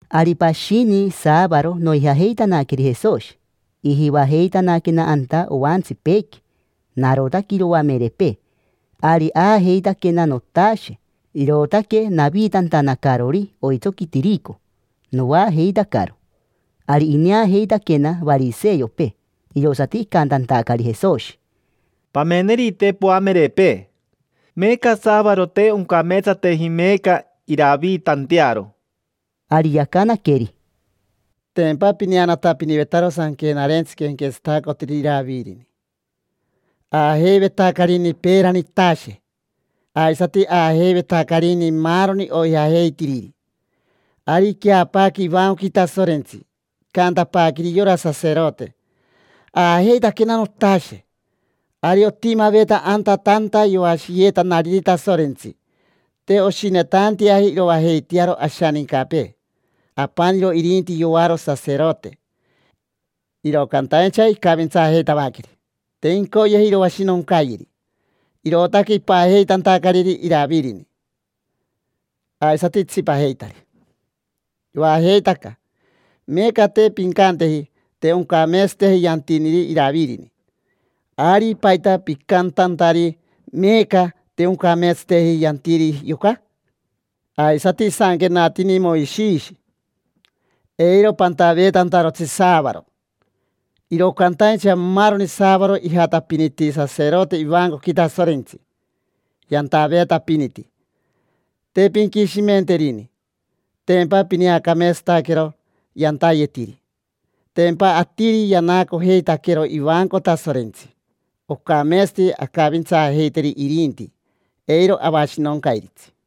Ari pashini saavaro noijajeitanaqueri Jesoshi, ijivajeitanaquena anta oantsipeequi. Narotaque iroamerepee. Ari aajeitaquena notashe, irootaque naviitantanacarori oitsoqui tirico, noajeitacaro. Ari ineajeitaquena variseopee, irosati icantantacari Jesoshi: —Pamenerite poamerepee. Meeca saavaro, te oncameetsateji meeca iraviitantearo. Ari yacanaqueri: —Tempa pineanatapinivetaro Sanquenarentsi quenquetsatacotiriri Iravirini. Aajeivetacarini peerani itashe, aisati aajeivetacarini maaroni oijajeitiriri. Ari iqueapaaque ivancoqui Tasorentsi, icantapaaqueri yora saserote: “Aajeitaquena notashe”. Ari otimaveta anta tanta yoashiyeetanariri Tasorentsi. Te oshinetanteaji iroajeitearo ashanincapee, apaniro irinti yoaro saserote. Iro cantaincha icavintsaajeitavaqueri, te incoyeji iroashinoncayeri, irootaque ipajeitantacariri Iravirini, aisati itsipajeitari. Yoajeitaca. Meeca te pincanteji: “Te oncameetsateji yantiniri Iravirini”, ari ¿paita picantantari meeca: “Te oncameetsateji yantiri yoca”? Aisati isanquenatini Moishishi: “Eiro pantaveetantarotsi saavaro”. Iro cantaincha maaroni saavaro ijatapiniti saserote ivancoqui Tasorentsi, yantaveetapiniti. Te pinquishimenterini, tempa pineacameetsataquero yantayetiri. Tempa atiri yanaacojeitaquero ivanco Tasorentsi, ocameetsati ancavintsaajeiteri irinti, eiro avashinoncairitsi.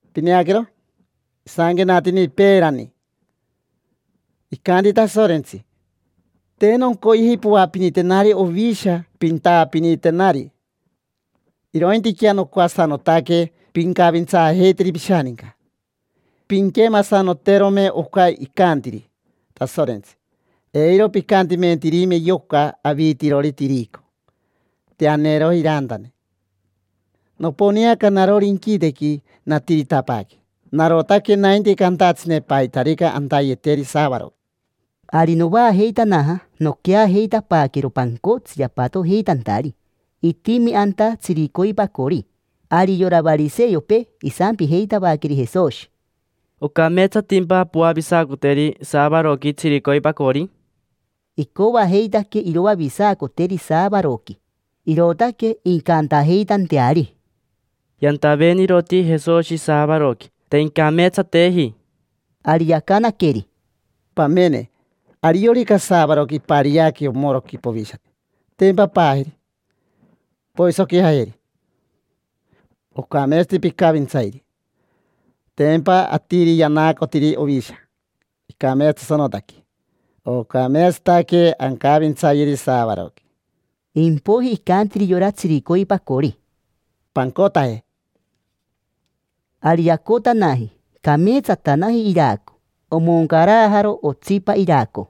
Pineaquero, isanquenatini peerani: “Icanti Tasorentsi: ‘Te noncoyeji poapinitenari ovisha, pintaapinitenari; irointiquea nocoasanotaque pincavintsaajeiteri pishaninca’”. Pinquemasanoterome oca icantiri Tasorentsi, eiro picantimentirime yoca aviitirori tirico, te aneeroji irantane. Noponeaca narori inquitequi, natiritapaaque. Narotaque nainti cantatsine paitarica antayeteri saavaroqui. Ari novaajeitanaja, noqueajeitapaaquero pancotsi yapatojeitantari. Itimi anta tsiricoipacori. Ari yora variseopee isampijeitavaqueri Jesoshi: —¿Ocameetsatimpa poavisacoteri saavaroqui tsiricoipacori? Icoajeitaque iroavisacoteri saavaroqui, irootaque incantajeitanteari: “Yantaveeniroti Jesoshi saavaroqui, te incameetsateji”. Ari yacanaqueri: —Pamene, ariorica saavaroqui impariaque omoroqui povishate, tempa paajeri, poisoquijajeri. Ocameetsati picavintsairi. Tempa atiri yanaacotiri ovisha icameetsatasanotaque. Ocameetsataque ancavintsayeri saavaroqui. Impoiji icantiri yora tsiricoipacori: —Pancotaje. Ari yacotanaji, cameetsatanaji iraco, omoncarajaro otsipa iraco.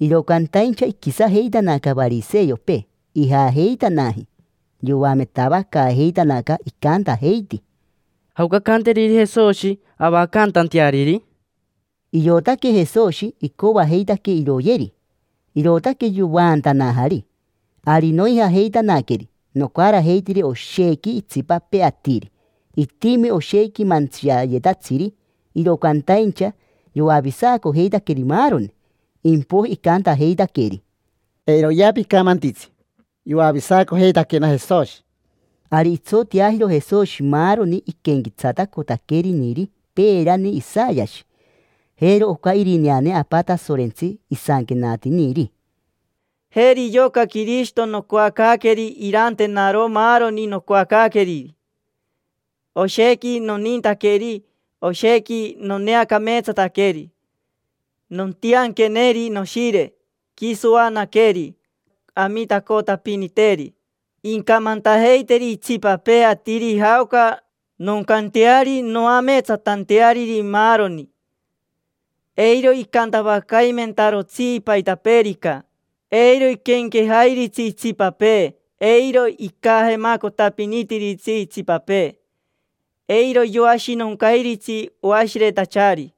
Iro cantaincha iquisajeitanaca variseopee. Ijajeitanaji, yoametavacaajeitanaca, icantajeiti: —¿Jaoca ancanteriri Jesoshi, avacantanteariri? Iotaque Jesoshi icoajeitaque iroyeri, irootaque yovaantanajari. Ari noijajeitanaqueri, nocarajeitiri oshequi itsipapee atiri. Itimi oshequi mantsiayetatsiri, iro cantaincha yoavisacojeitaqueri maaroni, impoiji icantajeitaqueri: —Eiroyea picamantitsi: “Yoavisacojeitaquena Jesoshi”. Ari itsoteajiro Jesoshi maaroni iquenquetsatacotaqueriniri peerani Isayashi. Jero oca irineane Apa Tasorentsi isanquenatiniri: “Jeri yoca Quirishito nocoacaaqueri irantenaro maaroni nocoacaaqueriri. Oshequi nonintaqueri, oshequi noneacameetsataqueri. Nontianqueneri noshire, quiso oanaqueri, amitacotapiniteri. Incamantajeiteri itsipapee atiri jaoca noncanteari noameetsatanteariri maaroni. Eiro icantavacaimentarotsi paitapeerica, eiro iquenquejairitsi itsipapee. Eiro icajemacotapinitiritsi itsipapee. Eiro yoashinoncairitsi oashiretachari.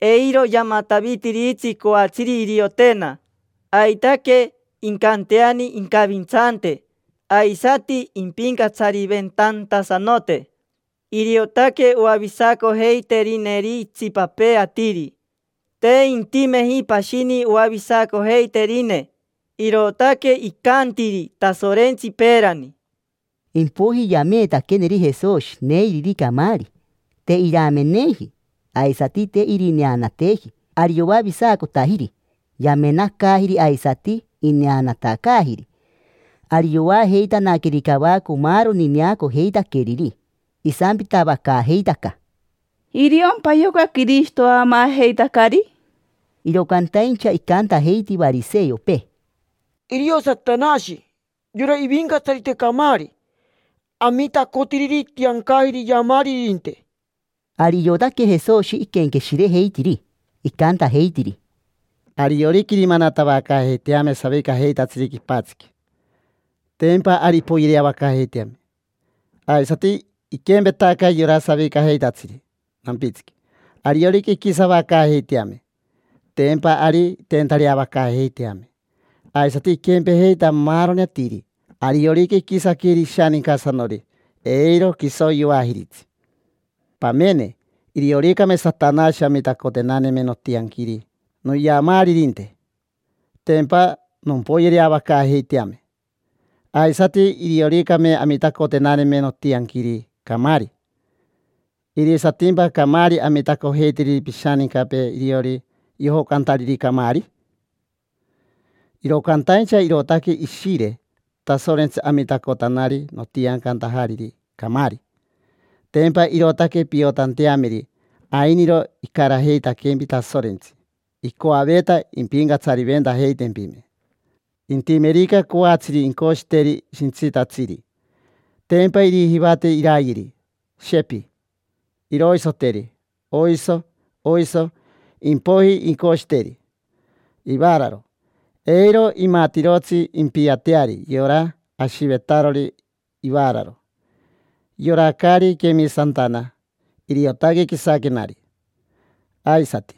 Eiro yamatavitiritsi coatsiri iriotena. Aitaque, incanteani incavintsante, aisati impincatsariventantasanote. Iriotaque oavisacojeiterineri itsipapee atiri, te intimeji pashini oavisacojeiterine”. Irootaque icantiri Tasorentsi peerani. Impoiji yameetaqueneri Jesoshi neiriri camaari: te irameneji, aisati te irineanateji. Ari yoavisacotajiri: yamenacaajiri aisati ineanatacaajiri. Ari yoajeitanaqueri cavaco maaroni neacojeitaqueriri. Isampitavacaajeitaca: —¿Iriompa yoca Quirishito aamaajeitacari? Iro cantaincha icantajeiti variseopee: —Irio Satanashi, yora ivincatsarite camaari, amitacotiriri itiancajiri iyamaaririnte. Ari iotaque Jesoshi iquenqueshirejeitiri, icantajeitiri: —Ariorica irimanatavacaajeiteame savicajeitatsiri quipatsiqui, tempa ari impoyereavacaajeiteame. Aisati iquempetaca yora savicajeitatsiri nampitsiqui, ariorica inquisavacaajeiteame, tempa ari inteentareavacaajeiteame. Aisati iquempejeita maaroni atiri, ariorica inquisaqueri ishanincasanori, eiro quiso yoajiritsi. Pamene: irioricame Satanashi amitacotenaneme notianquiri noyamaaririnte, tempa nompoyereavacaajeiteame. Aisati irioricame amitacotenaneme notianquiri camaari, ¿irisatimpa camaari amitacojeitiriri pishanincapee iriori yojocantariri camaari? Iro cantaincha irootaque Ishire Tasorentsi amitacotanari notiancantajariri camaari. Tempa irootaque piotanteameri ainiro icarajeitaquempi Tasorentsi, icoaveta impincatsariventajeitempime. Intimerica coatsiri incoshiteri shintsitatsiri, tempa irijivateri irayeri, shepi; iroisoteri, oiso, oiso. Impoiji incoshiteri ivaararo, eiro imatirotsi impiateari yora ashivetarori ivaararo. Yora caari quemisantana, iriotaque quisaquenari. Aisati,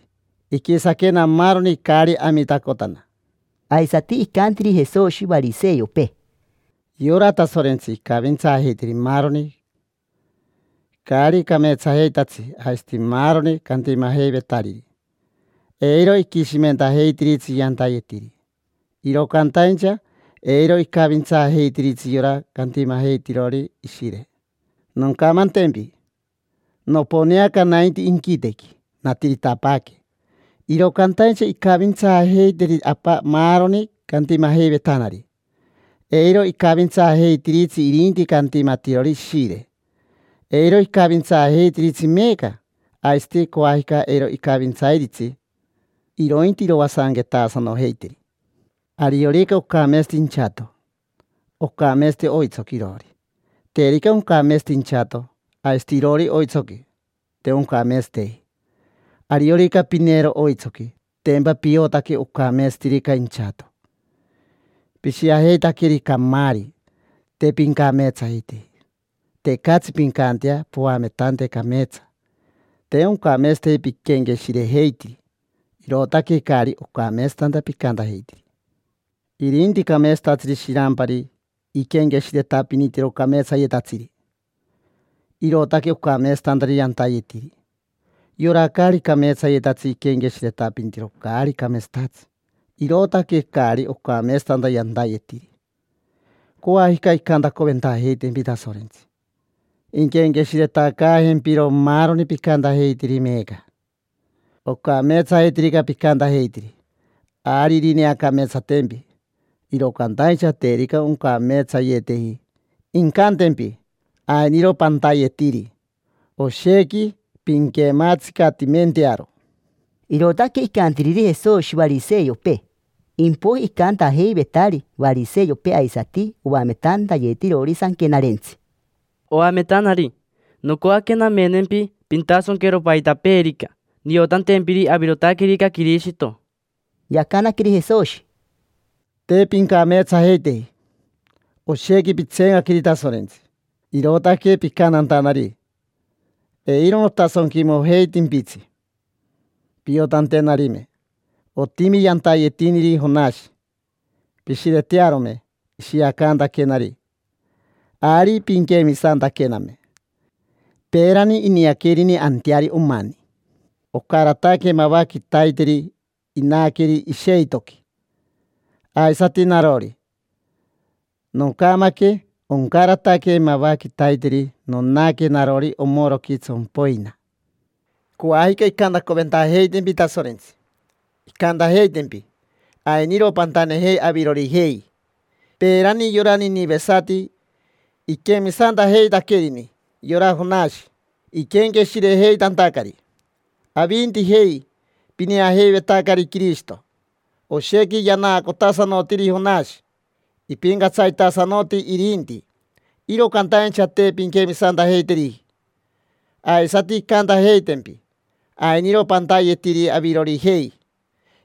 iquisaquena maaroni caari amitacotana. Aisati icantiri Jesoshi variseopee: —Yora Tasorentsi icavintsaajeitiri maaroni caari cameetsajeitatsi aisati maaroni cantimajeivetariri, eiro iquishimentajeitiritsi yantayetiri. Iro cantaincha eiro icavintsaajeitiritsi yora cantimajeitirori Ishire. Noncamantempi: noponeaca nainti inquitequi, natiritapaaque, iro cantaincha incavintsaajeiteri Apa maaroni cantimajeivetanari. Eiro icavintsaajeitiritsi irinti cantimatirori Ishire. Eiro icavintsairitsi meeca, aisati coajica eiro icavintsairitsi, irointi iroasanquetaasanojeiteri. Ariorica ocameetsati inchato, ocameetsati oitsoqui iroori; terica oncameetsateji inchato, aisati iroori oitsoqui, te ocameetsateji. Ariorica pineero oitsoqui, tempa piotaque ocameetsatirica inchato. Pishiajeitaqueri camaari, te pincameetsajeiteji: tecatsi pincantea poametante cameetsa. Te oncameetsateji piquenqueshirejeitiri, irootaque caari ocameetsatanta picantajeitiri. Irinti cameetsatatsiri shirampari iquenqueshiretapinitiro cameetsayetatsiri, irootaque ocameetsatantari yantayetiri. Yora caari cameetsayetatsi iquenqueshiretapinitiro caari cameetsatatsi, irootaque caari ocameetsatanta yantayetiri. Coajica incantacoventajeitaquempi Tasorentsi: inquenqueshiretacaajempiro maaroni picantajeitiri meeca. Ocameetsajeitirica picantajeitiri, ari irineacameetsatempi, iro cantaincha terica oncameetsayeteji, incantempi: “Ainiro pantayetiri, oshequi pinquematsicatimentearo”. Irootaque icantiriri Jesoshi variseopee. Impoiji icantajeivetari variseopee aisati oametantayetirori Sanquenarentsi: —Oametanari, nocoaque namenempi pintasonquero paitapeerica, niotantempiri avirotaquerica Quirishito. Yacanaqueri Jesoshi: —Te pincameetsajeiteji, oshequi pitseencaqueri Tasorentsi, irootaque picantantanari. Eiro notasonquimojeitimpitsi piotantenarime. Otimi yantayetiniri Jonashi: pishiretearome ishiacantaquenari, ari pinquemisantaquename. Peerani iniaquerini anteari omani, ocarataque mava quitaiteri inaqueri isheitoqui. Aisati narori, noncamaque, oncarataque mava quitaiteri nonaque narori omoroqui tsompoina. Coajica incantacoventajeitempi Tasorentsi, incantajeitempi: “Ainiro pantanejei avirorijei. Peerani yora ninivesati iquemisantajeitaquerini yora Jonashi, iquenqueshirejeitantacari. Avintijei, pineajeivetacari Quirishito, oshequi yanaacotasanotiri Jonashi, ipincatsaritasanoti irinti, iro cantaincha te pinquemisantajeiteriji”. Aisati incantajeitempi: “Ainiro pantayetiri avirorijei.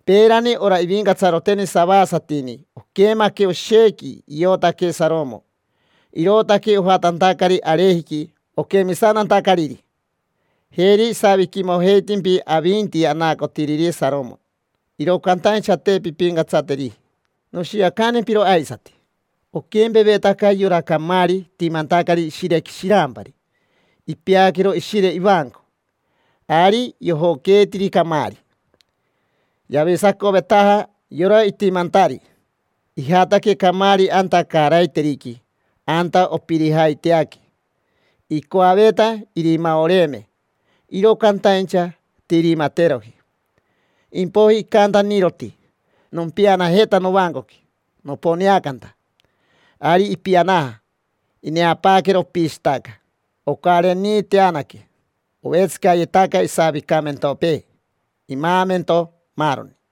Peerani ora ivincatsaroteni savasatini oquemaque oshequi iotaque Saromo, irootaque ojatantacari arejiqui oquemisantantacariri. Jeri isaviquimojeivetimpi avinti anaacotiriri Saromo, iro cantaincha te pimpincatsateriji”. Noshiacantempiro aisati: oquempevetaca yora camaari itimantacari ishirequi shirampari, ipeaquero ishire ivanco. Ari yojoqueetiri camaari, yavisacovetaja yora itimantari. Ijataque camaari anta caaraiteriqui, anta opirijaiteaque. Icoaveta irimaoreeme, iro cantaincha te irimateroji. Impoiji icantaniroti: “Nompianajeta novancoqui noponeacanta”. Ari ipianaja, ineapaaquero opishitaca, ocareniiteanaque, ovetsicayetaca isavicamentopee, imaamento, maaroni.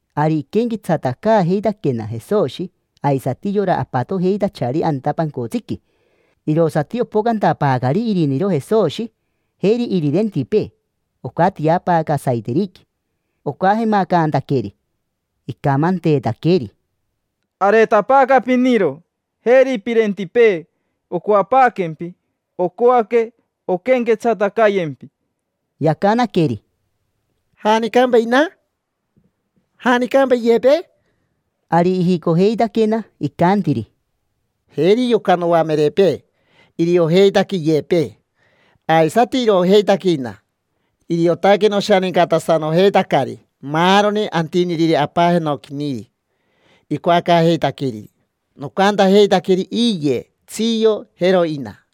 Ari iquenquetsatacaajeitaquena Jesoshi, aisati yora apatojeitachari anta pancotsiqui. Irosati opocantapaacari iriniro Jesoshi, jeri irirentipee, ocatiapaaca saiteriqui, ocajemacantaqueri. Icamanteetaqueri: —Areetapaaca piniro, jeri pirentipee, ocoapaaquempi. Ocoaque onquenquetsatacayempi. Yacanaqueri: —¿Janicampa ina? ¿Janicampa iyepee? Ari ijicojeitaquena, icantiri: —Jeri yoca noamerepee, iriojeitaque iyepee, aisati iroojeitaque ina. Iriotaque noshanincatasanojeitacari maaroni antiniriri Apa Jenoquiniri icoacaajeitaqueriri: nocantajeitaqueri iye, tsio, jero ina.